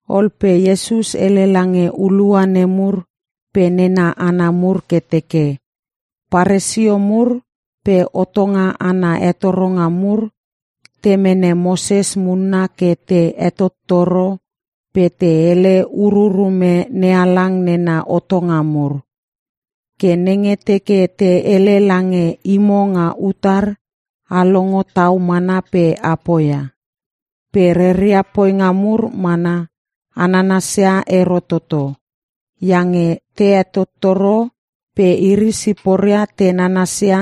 Ol pe Iesus hele lange hulua nemur pe nena hana mur ke teke, “Paresio mur pe hotonga ana hetoronga mur te mene Moses munna ke te hetottoro pe te hele ururume NeHalang nena hotonga mur. Ke nenge teke te hele lange imo nga utar, a longo tau mana pe a poia. Pe reria poinga mur mana, a nanasia ero toto. Iange te hetottoro pe iri siporia te nanasia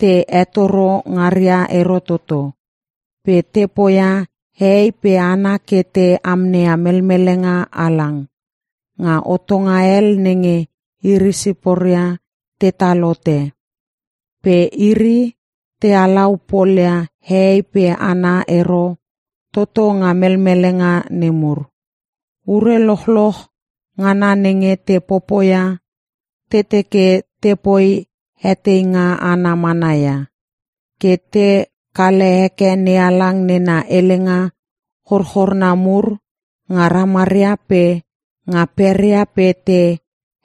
te hetoro ngaria ero toto. Pe te poia hehei pe hana ke te amneia melmelenga halang, nga hotonga hel nenge iri siporia tetal hote. Pe iri te halau polia hehei pe hana ero toto nga melmelenga nemur. “Ure lochloch ngana nenge te popoia, te teke te poi heteinga ana mana ia. Ke te kale heke NeHalang nena helenga chorchorna mur nga ramaria pe nga peria pe te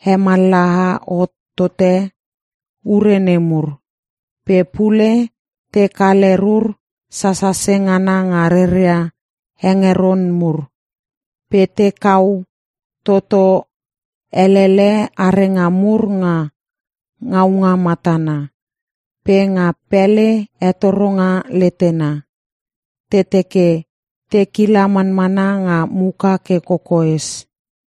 hemallaha hot tote ure nemur. Pe pule te kale rur sasase ngana nga reria hengeron mur. Pe te kau toto elele arenga mur nga ngaunga matana. Pe nga pele hetoronga letena, te teke te kila manmana nga muka ke kokoes.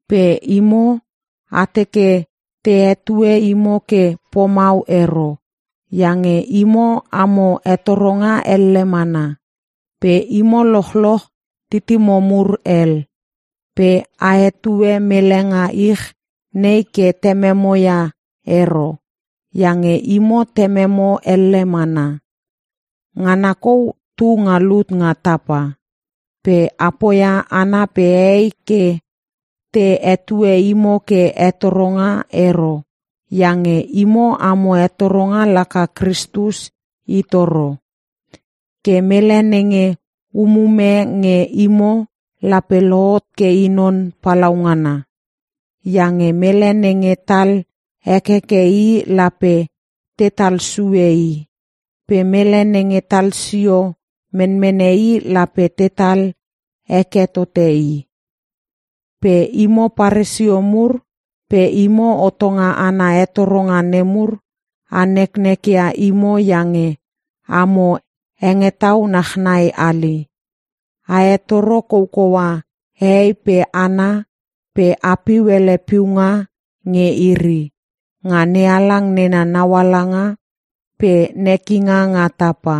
“Pe imo, a teke te hetue imo ke pomau ero. Iange imo amo hetoronga elle mana. Pe imo lochloch titimo mur hel. Pe a hetue mele nga ich nei ke tememo ia ero. Iange imo tememo elle mana. Ngana kou tu nga lut nga tapa. Pe a poia hana pe hehei ke te hetue imo ke ‘Hetoronga’ ero iange imo amo Hetoronga laka Kristus I toro. Ke mele nenge umume nge imo lape lohot ke i non palaungana. Iange mele nenge tal hekeke i lape tetal sue i, pe mele nenge talsio menmene i lape tetal heke tote i. “Pe imo Paresio mur pe imo hotonga ana hetoronga nemur, a neknek ia imo iange amo hengetau nachnai hali. A hetoro kokoua hehei pe hana pe a piu hele piunga nge iri, nga NeHalang nena naualanga pe nekinga nga tapa.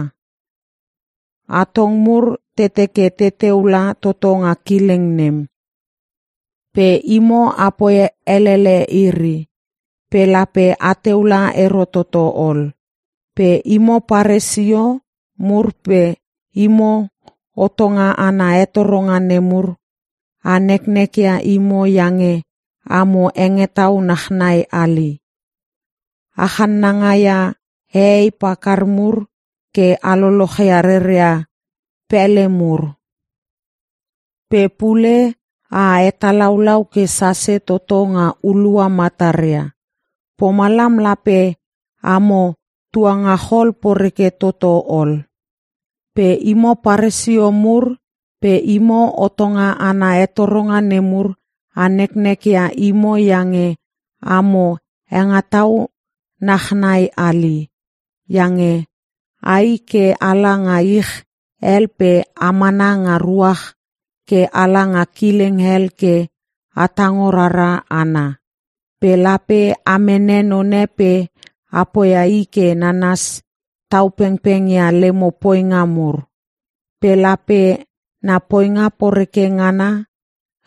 Atong mur te teke teteu la toto nga kileng nem. Pe imo apoi helele iri. Pe lape ateu la ero toto ol. [ “Pe imo Paresio mur pe imo hotonga ana hetoronga nemur, a neknek ia imo iange amo hengetau nachnai hali. A chananga ia hehei pakar mur ke a lolochia reria pele mur. Pe pule a hetalaulau ke sase toto nga hulua mataria. Pomalam, lape amo tuangachol poreke toto ol!] “Pe imo Paresio mur pe imo hotonga ana hetoronga nemur, a neknek ia imo iange amo hengetau nach nai hali. Iange ai ke ala nga ich hel pe a mana nga ruach ke ala nga kileng hel ke a tango rara hana. Pe lape a mene none pe a poia i ke nanas tau pengpeng ia lemo poinga mur. Pe lape na poinga poreke ngana,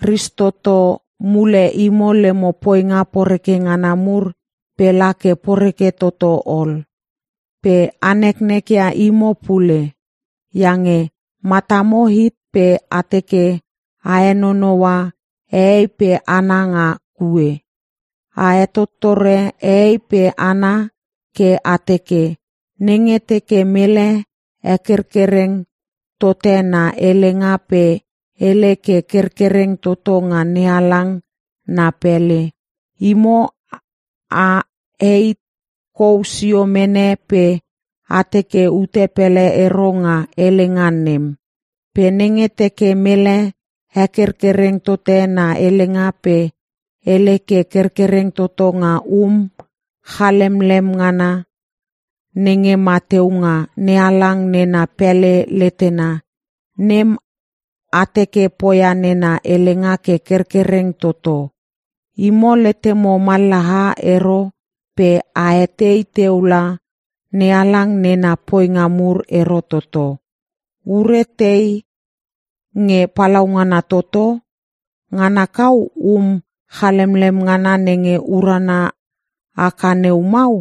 ristoto mule imo lemo poinga poreke ngana mur pe la ke poreke toto ol. “Pe a neknek ia imo pule. Iange matamo hit pe a teke a henonoua hehei pe hana nga kue. A hetottore hehei pe hana ke a teke, nenge teke mele hekerkereng tote na helenga pe hele ke kerkereng toto nga NeHalang na pele, imo a heit kou sio mene pe a teke ute pele ero nga helenga nem. Pe nenge teke mele hekerkereng tote na helenga pe hele ke kerkereng toto nga um chalemlem ngana (gol) nenge ma teu nga NeHalang nena pele letena, nem a teke poia nena helenga ke kerkereng toto. Imo letemo mallaha ero pe a etei teu langa NeHalang nena poinga mur ero toto. Ure tei nge palaungana toto? Ngana kau um chalemlem ngana nenge uruna haka neu mau?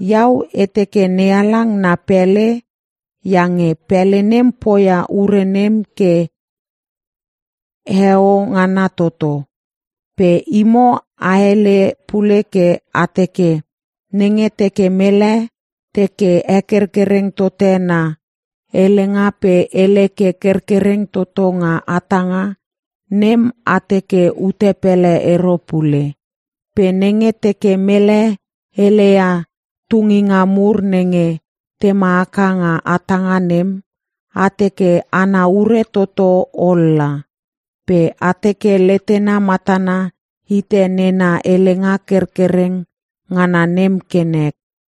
Iau e teke NeHalang na pele, iange pele nem poia ure nem ke heo ngana toto. Pe imo a hele pule ke a teke, ‘Nenge teke mele teke hekerkereng tote na helenga pe hele ke kerkereng toto nga hatanga, nem a teke ute pele ero pule. Pe nenge teke mele heleia tunginga mur nenge tema haka nga hatanga nem, a teke ana ure toto ol la. Pe a teke letena matana hite nena helenga kerkereng ngana nem ke nek.’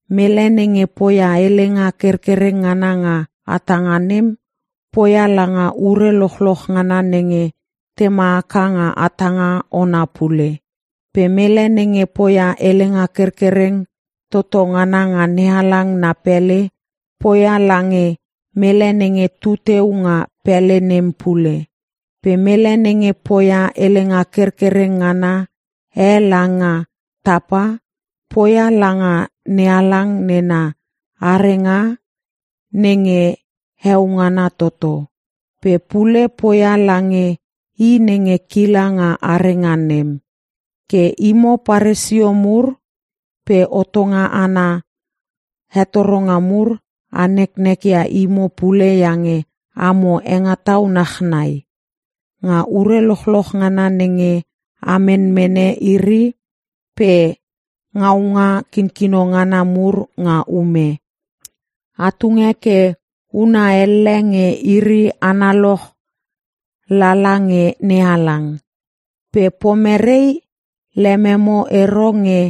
Mele nenge poia helenga kerkereng ngana nga hatanga nem, poia langa ure lochloch ngana nenge tema haka nga hatanga ona pule. Pe mele nenge poia helenga kerkereng toto ngana nga NeHalang na pele, poia lange mele nenge tu teu nga pele nem pule. Pe mele nenge poia helenga kerkereng ngana e langa tapa, poia langa NeHalang nena arenga nenge heo ngana toto. Pe pule poia lange I nenge kila nga arenga nem. “Ke imo Paresio mur pe hotonga ana hetoronga mur, a neknek ia imo pule iange amo hengetau nach nai. Nga ure lochloch ngana nenge a menmene iri pe ngaunga kinkino ngana mur nga ume, a tunge ke huna elle nge iri analoch lala nge NeHalang. Pe pomerei lememo ero nge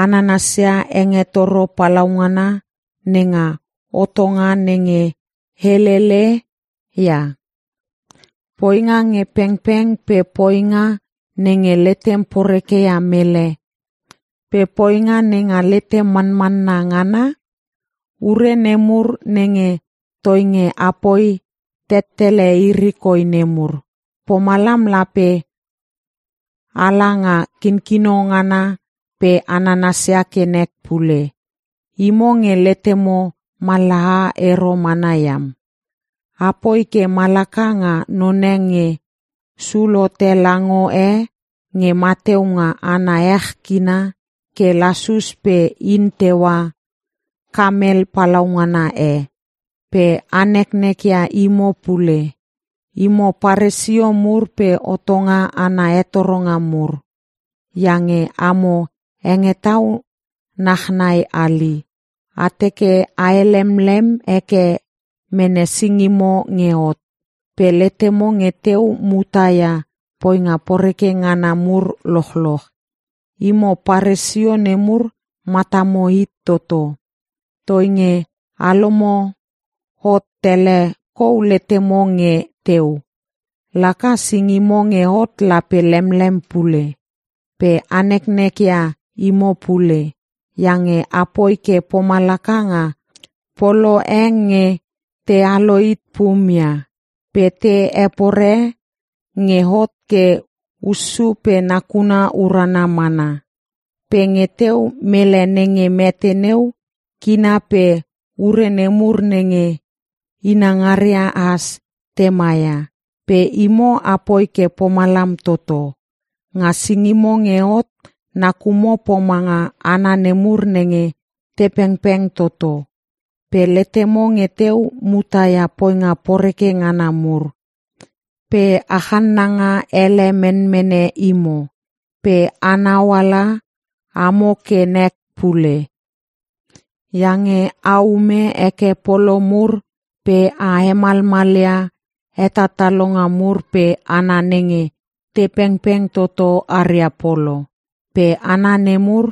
a nanasia hengetoro palaungana nenga hotonga nenge helele ia; poinga nge pengpeng, pe poinga nenge letem poreke ia mele, pe poinga nenga letem manmanna ngana? Ure nemur nenge toinge apoi tettele iri koi nemur, pomalam lape a la nga kinkino ngana pe a nanasia ke nek pule. Imo nge letemo mallaha ero mana iam. A poi ke malaka nga none nge sul hote lango e nge mateu nga ana ech kina ke lasus pe in teua kamel palaungana e. “Pe a neknek ia imo pule. Imo Paresio mur pe hotonga ana hetoronga mur. Iange amo hengetau nach nai hali. A teke a helemlem heke mene singimo nge hot. Pe letemo nge teu muta ia poinga poreke ngana mur lochloch. Imo Paresio nemur matamo hit toto. Toinge a lomo hot tele kou letemo nge teu, laka singimo nge hot lape lemlem pule. “Pe a neknek ia imo pule. Iange apoi ke pomalaka nga polo e nge te alohit pum ia. Pe te hepore nge hot ke hussu pe nakuna urana mana. Pe nge teu mele nenge mete neu kina pe ure nemur nenge inangaria has, te maia. Pe imo apoi ke pomalam toto. Nga singimo nge hot, nakumo pomanga hana nemur nenge te pengpeng toto. Pe letemo nge teu muta ia poinga poreke ngana mur, pe a channanga ele menmene imo. “Pe a nauala amo ke nek pule. Iange a ume heke polo mur pe a hemalmalia hetatalonga mur pe hana nenge te pengpeng toto aria polo. Pe hana nemur,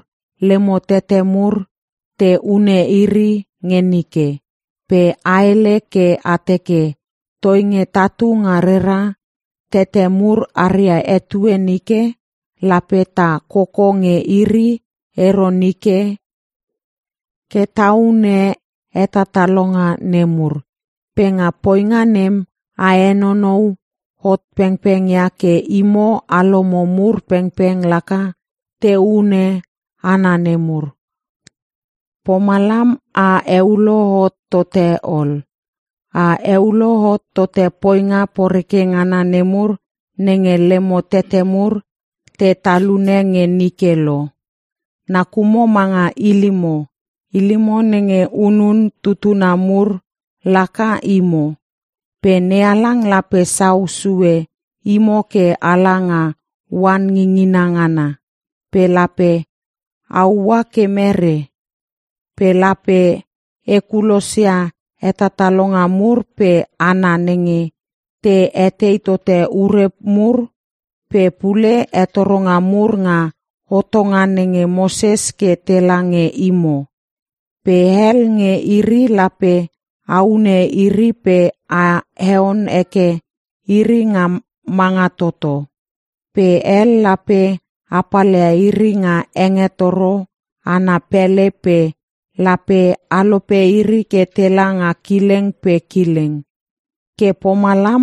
lemo tete mur te hune iri nge nike. Pe a hele ke a teke, ‘Toinge tatu nga rera tete mur aria etue nike, lape ta koko nge iri ero nike ke ta hune hetatalonga nemur.’ Pe nga poinga nem, a henonou hot pengpeng ia ke imo alomo mur pengpeng laka te hune hana nemur. Pomalam, a heulo hot tote ol! A heulo hot tote poinga poreke ngana nemur nenge lemo tete mur te talune nge nike lo! “Nakumo manga ilimo! Ilimo nenge hunun tutuna mur laka imo! Pe NeHalang lape sau sue imo ke ala nga oan ngingina ngana. Pe lape a ua ke merei? Pe lape e kulosia hetatalonga mur pe hana nenge te etei tote ure mur pe pule hetoronga mur nga hotonga nenge Moses ke tela nge imo. Pe hel nge iri lape a hune iri pe a heon heke iri nga manga toto. Pe hel lape a palia iri nga hengetoro ana pele pe lape a lope iri ke tela nga kileng pe kileng. Ke pomalam,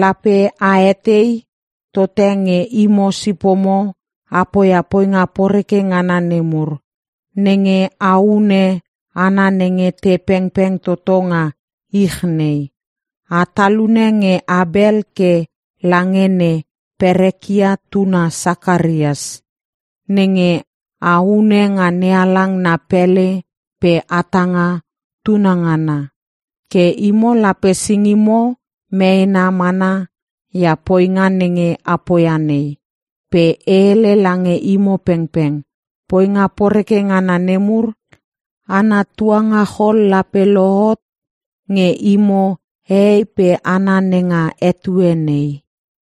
lape a etei tote nge imo sipomo a poia poinga poreke ngana nemur. Nenge a hune hana nenge te pengpeng toto nga ich nei. A talune nge Abel ke lange ne Perekia tuna Sakarias, nenge a hune nga NeHalang na pele pe hatanga tunangana. Ke imo lape singimo meena mana ia poinga nenge a poia nei. Pe e hele lange imo pengpeng, poinga poreke ngana nemur ana tuangachol lape lohot nge imo hehei pe hana nenga etue nei.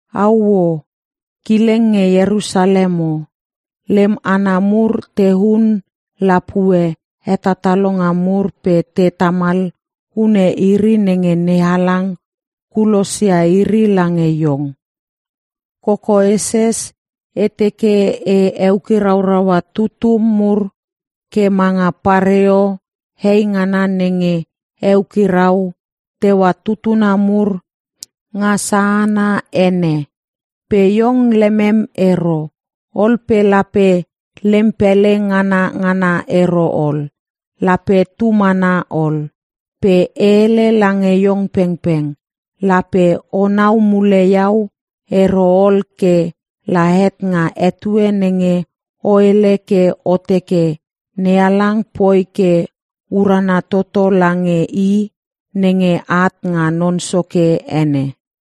“Auoh! Kileng nge Ierusalem o! Lem hana mur te hun lapue hetatalonga mur pe te tamal hune iri nenge NeHalang kulosia iri lange iong. Kokoeses e teke e eukirauraua tutum mur ke manga pareo hei ngana nenge eukirau teua tutuna mur nga sahana ene. Pe iong lemem ero. Ol pe lape lem pele ngana ngana ero ol. Lape tu mana ol. Pe e hele lange iong pengpeng, lape o nau mule Iau ero ol ke la het nga etue nenge o hele ke o teke, ‘NeHalang poi ke urana toto lange I nenge at nga Non Soke ene.’”